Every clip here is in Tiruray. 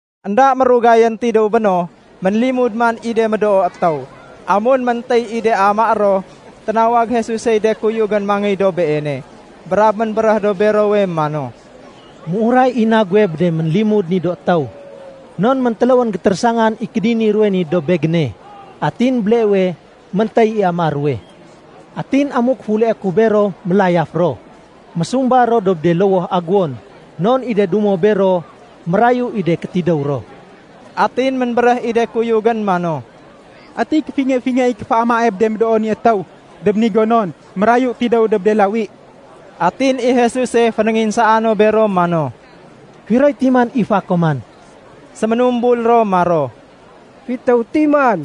Enda mérugayén tidéw béno, ménlimud man i de médoo étéw. Amun méntéy i de amaé ro, ténawag Jesusey de kuyugén mangéy dob Beene, brab ménbéréh dob berowe mano, “Méuray i na guwe bé de ménlimud ni do étéw, non méntéléwén gétérésangan i kédini ruwe ni dob Begéne, atin béleewe méntéy i amaé ruwe. Atin amuk féuleé ku bero mélayaf ro, mésumba ro dob de lowoh aguwon, non i de dumo bero mérayu i de kétidéw ro.” Atin ménbéréh i de kuyugén mano, “Ati kéfingé-fingé i kéféamae bé de médoo ni étéw dob ni gonon mérayu tidéw dob de lawi?” Atin i Jesuse fénénginsaa no bero mano, “Firoy timan i fa koman?” Séménumbul ro maro, “Fitéw timan.”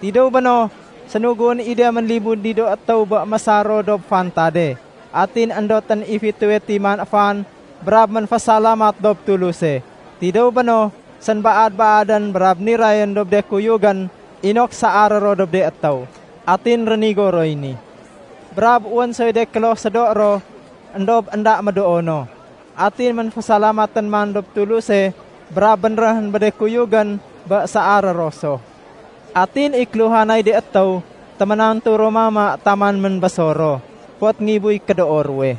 Tidéw béno, sénuguén i de ménlimud ni do étéw bé mésar ro dob fantade. Atin éndotén i fitéwe timan fan brab ménfésalamat dob Tuluse. Tidéw béno, sénbaad-baadén, brab nirayén dob de kuyugén inok saaré ro dob de étéw. Atin rénigo roy ni. Brab wén soy do kloh sédo ro, éndob énda médoo no. Atin ménfésalamatén man dob Tuluse brab bénréhén bé de kuyugén bé saaré ro so. Atin i kéluhanay de étéw, téménantu ro mama taman ménbésor ro. Fot ngibuy kédoo ruwe.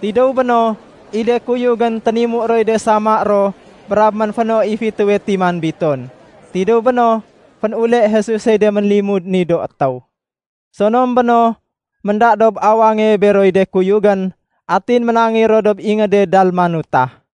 Tidéw béno, i de kuyugén ténimu roy de sama ro brab ménféno i fitéwe timan biton. Tidéw béno, fénule Jesusey de ménlimud ni do étéw. Sonom béno, ménda dob awange beroy de kuyugén, atin ménangéy ro dob ingéde Dalmanuta.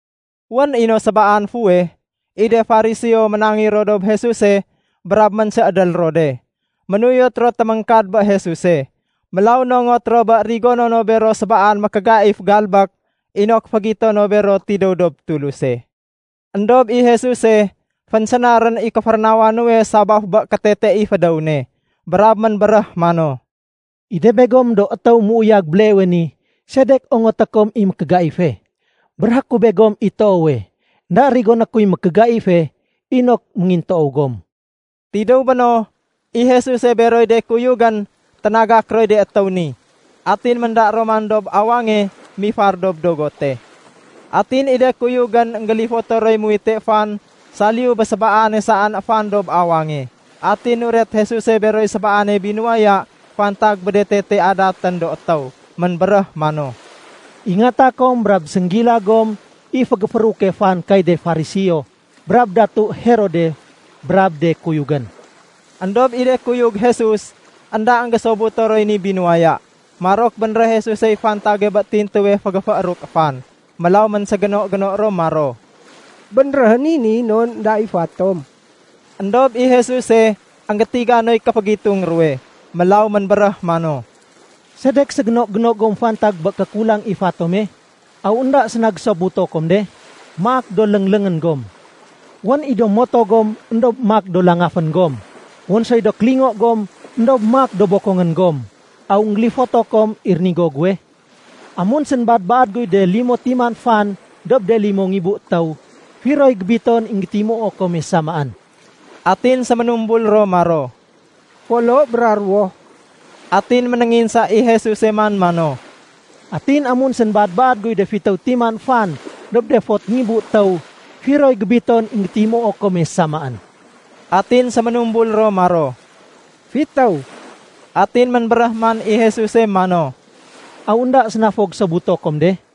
Wén i no sébaan fuweh, i de Fariseo ménangéy ro dob Jesuse brab ménséédél ro de. Ménuyot ro téméngkad bé Jesuse, mélaw nongot ro bé rigono no bero sébaan mékégaif galbék inok fégito no bero tidéw dob Tuluse. Endob i Jesuse fénsénarén i kéférénawa nuwe sabaf bé kétete i fédéw ne. Brab ménbéréh mano, “I de begom do étéw méuyag béleewe ni, sedek ongoté kom i mékégaife? Béréhé ku begom i toowe, énda rigoné kuy mékégaife inok méngintoow gom.” Tidéw béno, i Jesuse beroy de kuyugén ténagak roy de étéw ni, atin ménda ro man dob awange mifar dob dogote. Atin i de kuyugén énggélifoto roy muwite fan saliyu bé sébaane saén fan dob awange. Atin nuret Jesuse beroy sébaane binuwaya fantag bé de tete adatén do étéw. Ménbéréh mano, “Ingata kom brab sénggila gom i fégéfééruke fan kay de Fariseo brab datu Herode brab de kuyugén.” Endob i de kuyug Jesus, énda énggésobuto roy ni binuwaya. Marok bénréh Jesusey fantage bé tintuwe fégéfééruk fan. Mélaw ménségéno-géno ro maro, “Bénréhén i ni non énda i fa tom.” Endob i Jesuse énggétiga noy kéfégitung ruwe. Mélaw ménbéréh mano, “Sedek ségéno-géno gom fantag bé kékulang i fa tome? Aw énda séna gésobuto kom de? Maak do léngléngén gom. Wén i do moto gom éndob maak do langafén gom. Wén soy do kélingo gom éndob maak do bokongén gom. Aw énggélifoto kom i rénigo guwe? Amun sénbaad-baad guy de limo timan fan dob de limo ngibu étéw, firoy gébiton i énggétimuo kome samaén?” Atin séménumbul ro maro, “Folo bra ruwo.” Atin ménénginsa i Jesuse man mano, “Atin amun sénbaad-baad guy de fitéw timan fan dob de fot ngibu étéw, firoy gébiton i énggétimuo kome samaén?” Atin séménumbul ro maro, “Fitéw.” Atin ménbéréh man i Jesuse mano, “Aw énda séna fo gésobuto kom de?”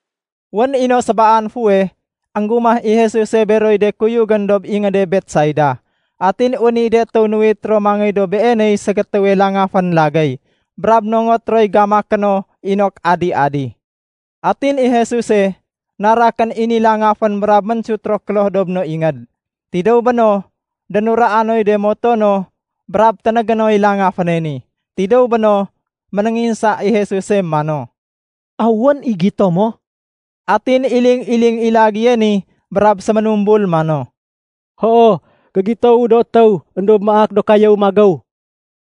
Wén i no sébaan fuweh, énggumah i Jesuse beroy de kuyugén dob ingéde Betsaida. Atin wén i de étéw nuwit ro mangéy dob Beeney ségétéwe langafén lagéy, brab nongot roy gamaké no inok adi-adi. Atin i Jesuse, narakén i ni langafén brab ménsut ro kloh dob no ingéd. Tidéw béno, dénuraa noy de moto no brab ténégé noy langaféne ni. Tidéw béno, ménénginsa i Jesuse mano, “Aw wén i gito mo?” Atin iling-iling i lagéye ni brab séménumbul mano, “Hoo, gégitowu do étéw éndob maak do kayéw magéw.”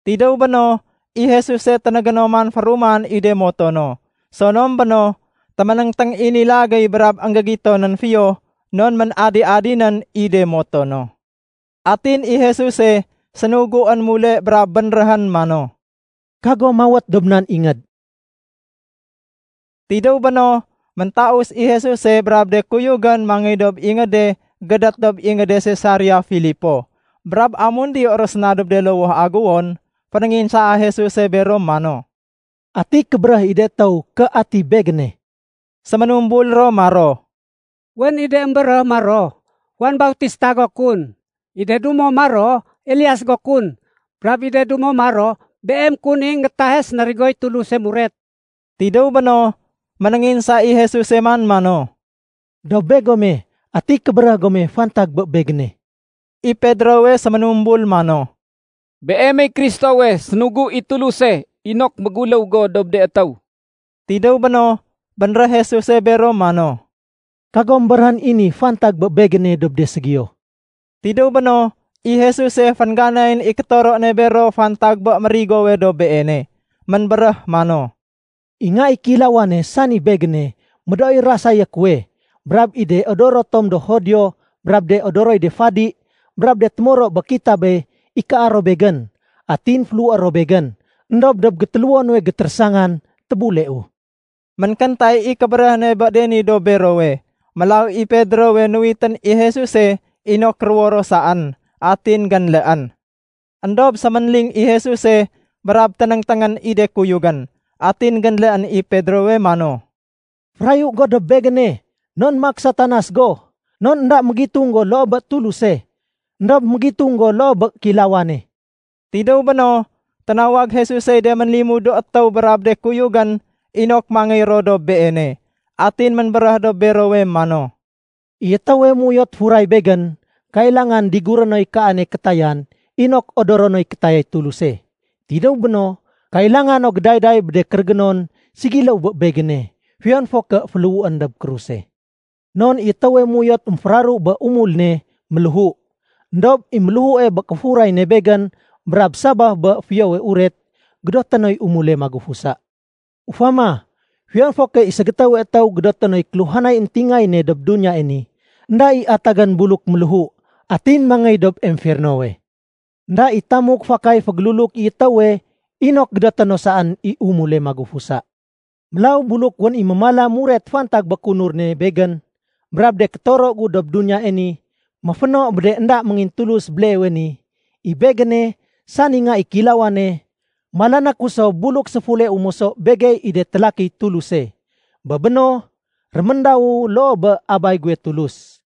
Tidéw béno, i Jesuse ténégé no man féruman i de moto no. Sonom béno, téménéngténg i ni lagéye brab énggégitonén fiyo non ménadi-adinén i de moto no. Atin i Jesuse sénuguén mule brab bénréhén mano, “Kago mawét dob nan ingéd.” Tidéw béno, méntaus i Jesuse brab de kuyugén mangéy dob de ingéd gédét dob ingéde Sisarea Filipo. Brab amun diyo ro séna dob de lowoh aguwon, fénénginsaa Jesuse bero mano, “Ati kébéréh i de étéw ké ati Begéne?” Séménumbul ro maro, “Wén i de émbéréh maro, Juan Bautista go kun. I de dumo maro, Elias go kun. Brab i de dumo maro, Beem kun i énggétahe sénarigoy Tuluse muret.” Tidéw béno, ménénginsa i Jesuse man mano, “Dob begome, ati kébéréh gome fantag bé Begéne?” I Pedrowe séménumbul mano, “Beemey Kristowe sénugu i Tuluse inok méguléw go dob de étéw.” Tidéw béno, bénréh Jesuse bero mano, “Kagom béréhén i ni fantag bé Begéne dob de ségiyo.” Tidéw béno, i Jesuse féngganayén i kétoro ne bero fantag bé mérigowe dob Beene. Ménbéréh mano, “I Nga i Kéilawane, sani Begéne, médooy rasayé kuwe. Brab i de odoro tom do Judio brab de odoroy de fadi brab de témoro bé kitabe ikaa ro Begén. Atin féléhué ro Begén. Endob dob gétéléwo nuwe gétérésangan tébuleu.” Ménkéntay i kébéréh ne bé ni dob berowe. Mélaw i Pedrowe nuwitén i Jesuse inok ruwo ro saén, atin génléén. Endob séménling i Jesuse brab ténéngténgén i de kuyugén. Atin génléén i Pedrowe mano, “Férayu go dob Begéne, non maak Satanas go. Non énda mégitung go loo bé Tuluse, éndob mégitung go loo bé kéilawane.” Tidéw béno, ténawag Jesusey de ménlimud do étéw brab de kuyugén inok mangéy ro dob Beene. Atin ménbéréh dob berowe mano, “I étéwe méuyot furay Begén, kailangan diguré noy kaane kétayan inok odoro noy kétayay Tuluse. Tidéw béno, kailanga no gédayday bé de kérégénon ségiléw bé Begéne, fiyon fo ké féléhuén dob kruse. Non i étéwe méuyot émféraru bé umul ne, méléhu. Endob i méléhue bé kéfuray ne Begén brab sabaf bé Fiyowe Uret, gédoté noy umule magufusa. Ufama, fiyon fo ké i ségétéwe étéw gédoté noy kéluhanay éntingayéne dob duniyae ni, énda i atagén buluk méléhu atin mangéy dob emfernowe. Enda i tamuk fakay fégéluluk i étéwe inok gédoté no saén i umule magufusa. Mélaw buluk wén i mémala muret fantag bé kéunur ne Begén brab de kétoro gu dob duniyae ni méféno bé de énda méngintulus béleewe ni, i Begéne, sani Nga i Kéilawane, malané ku so buluk séfuleu moso begey i de télakiy Tuluse. Bé béno, réméndawu loo bé Abay guwe Tulus.”